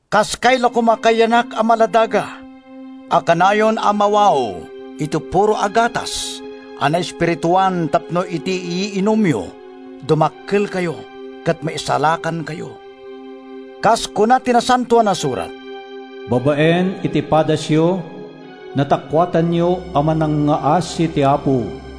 Kaskay la koma kayyanak a maladaga a kanayon a mawaw iti puro a gatas a naespirituan tapno iti yiinumyo, dumakkelkayo ket maisalakankayo. Kas kuna ti Nasantoan a Surat, “Babaen iti padasyo, natakuatanyo a manangngaasi ti Apo.”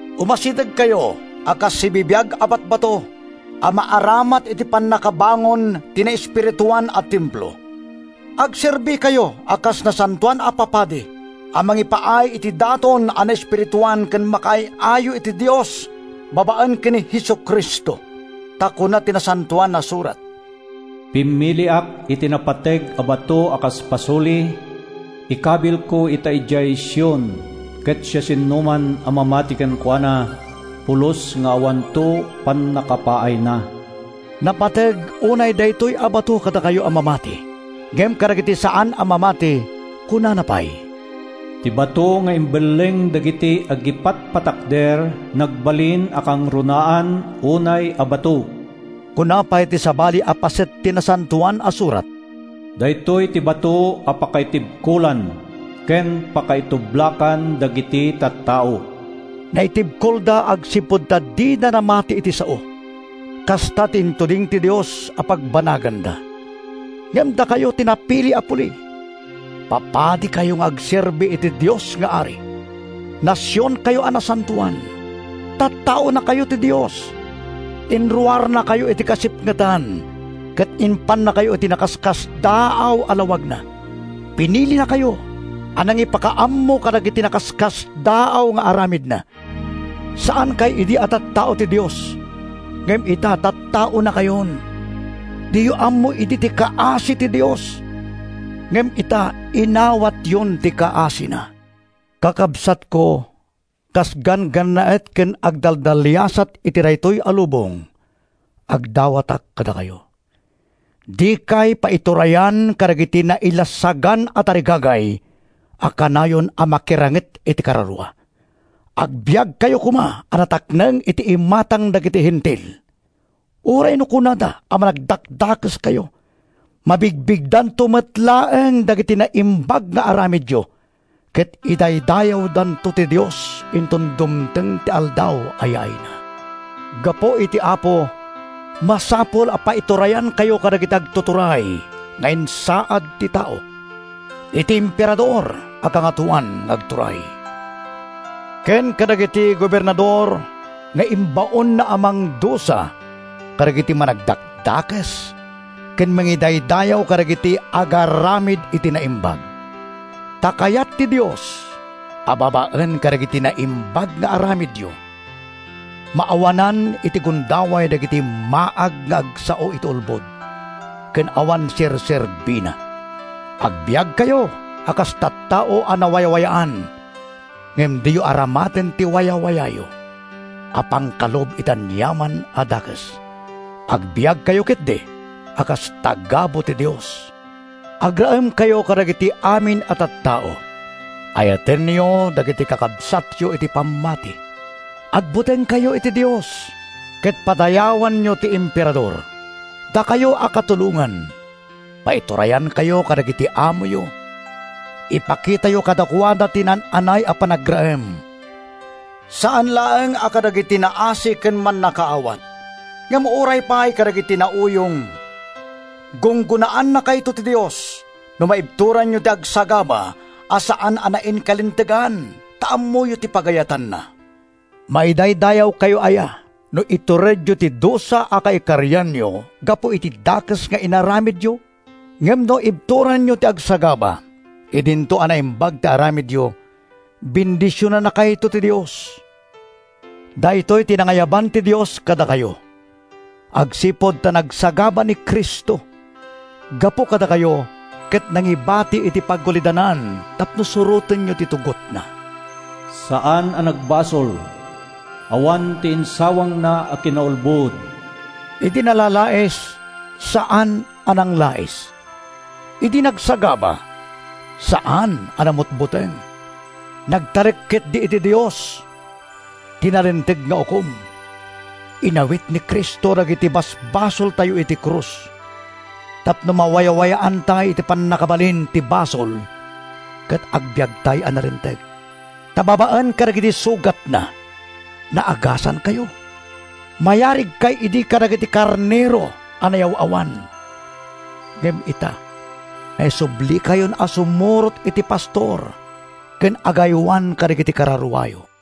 Umasidegkayo a kas sibibiag a batbato a maaramat iti pannakabangon ti naespirituan a templo. Agserbikayo a kas nasantoan a papadi a mangipaay iti daton a naespirituan ken makaay-ayo iti Dios babaen ken Jesu-Cristo. Ta kuna ti Nasantoan a Surat: “Pimmiliak iti napateg a bato a kas pasuli; ikabilko ita idiay Sion. Ket siasinoman a mamati kenkuana, pulos nga awanto pannakapaayna.” Napateg unay daytoy a bato kadakayo a mamati. Ngem kadagiti saan a mamati, kunana pay: “Ti bato nga imbelleng dagiti agipatpatakder, nagbalin a kangrunaan unay a bato.” Kuna pay ti sabali a paset ti Nasantoan a Surat: “Daytoy ti bato a pakaitibkolan, ken pakaitublakan dagiti tattao.” Naitibkolda agsipud ta dida namati iti sao. Kasta ti intuding ti Dios a pagbanaganda. Ngem dakayo ti napili a puli. Papadikayo nga agserbi iti Dios nga Ari. Nasionkayo a nasantoan. Tattaonakayo ti Dios. Inruarnakayo iti kasipngetan ket impannakayo iti nakaskasdaaw a lawagna. Pinilinakayo a nangipakaammo kadagiti nakaskasdaaw nga aramidna. Saankay idi a tattao ti Dios, ngem ita tattaonakayon. Diyo ammo idi ti kaasi ti Dios, ngem ita inawatyon ti kaasina. Kakabsatko, kas ganggannaet ken agdaldaliasat iti daytoy a lubong, agdawatak kadakayo. Dikay paiturayan kadagiti nailasagan a tarigagay a kanayon a makiranget iti kararua. Agbiagkayo koma a natakneng iti imatang dagiti Hentil. Uray no kunada a managdakdakeskayo, mabigbigdanto met laeng dagiti naimbag nga aramidyo ket idaydayawdanto ti Dios inton dumteng ti Aldaw a yaayna. Gapu iti Apo, masapul a paiturayankayo kadagiti agtuturay nga insaad ti tao: iti Emperador a kangatoan nga agturay, ken kadagiti gobernador nga imbaonna a mangdusa kadagiti managdakdakes ken mangidaydayaw kadagiti agaramid iti naimbag. Ta kayat ti Dios a, babaen kadagiti naimbag nga aramidyo, maawanan iti gundaway dagiti maag nga agsao iti ulbod ken awan serserbina. Agbiagkayo a kas tattao a nawayawayaan, ngem diyo aramaten ti wayawayayo a pangkalub iti aniaman a dakes. Agbiagkayo ketdi a kas tagabu ti Dios. Agraemkayo kadagiti amin a tattao. Ayatenyo dagiti kakabsatyo iti pammati. Agbutengkayo iti Dios ket padayawanyo ti Emperador. Dakayo a katulongan, paiturayankayo kadagiti amoyo. Ipakitayo kadakuada ti naan-anay a panagraem, saan laeng a kadagiti naasi ken mannakaawat, ngem uray pay kadagiti nauyong. Gunggonaannakayto ti Dios no maibturanyo ti agsagaba a saan a nainkalintegan ta ammoyo ti pagayatanna. Maidaydayawkayo aya no ituredyo ti dusa a kaikarianyo gapu iti dakes nga inaramidyo? Ngem no ibturanyo ti agsagaba idinto a naimbag ti aramidyo, bendisionannakayto ti Dios. Daytoy ti nangayaban ti Dios kadakayo, agsipud ta nagsagaba ni Cristo gapu kadakayo ket nangibati iti pagulidanan tapno surotenyo ti tugotna. Saan a nagbasol. Awan ti insawangna a kinaulbod. Idi nalalais, saan a nanglais. Idi nagsagaba, saan a namutbuteng. Nagtalek ketdi iti Dios, ti nalinteg nga Ukom. Inawit ni Cristo dagiti basbasoltayo iti krus tapno mawayawayaantay iti pannakabalin ti basol ket agbiagtay a nalinteg. Ta babaen kadagiti sugatna, naagasankayo. Mayarigkay idi kadagiti karnero a nayaw-awan. Ngem ita, naisublikayon a sumurot iti Pastor ken Agaywan kadagiti kararuayo.